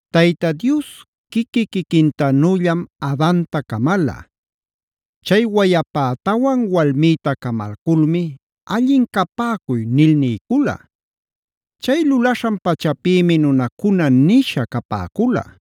Tayta Dios quiqui-quiquintanüllam Adanta camala. Chay wayapätawan walmïta camalculmi “allin capäcuy” nil niycula. Chay lulaśhan pachapïmi “nunacuna” nisha capäcula.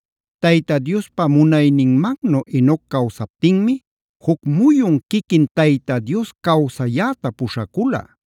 Tayta Diospa munayninmannu Enoc cawsaptinmi juc muyun quiquin Tayta Dios cawsayäta puśhacula.b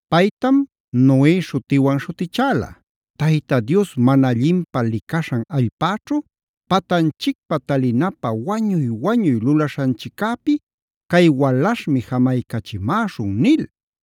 Paytam Noe śhutiwan śhutichäla: “Tayta Dios mana allinpä licaśhan allpäćhu, patanchicpä talinapä wañuy-wañuy lulaśhanchiccäpi cay walaśhmi jamaycachimäśhun” nil.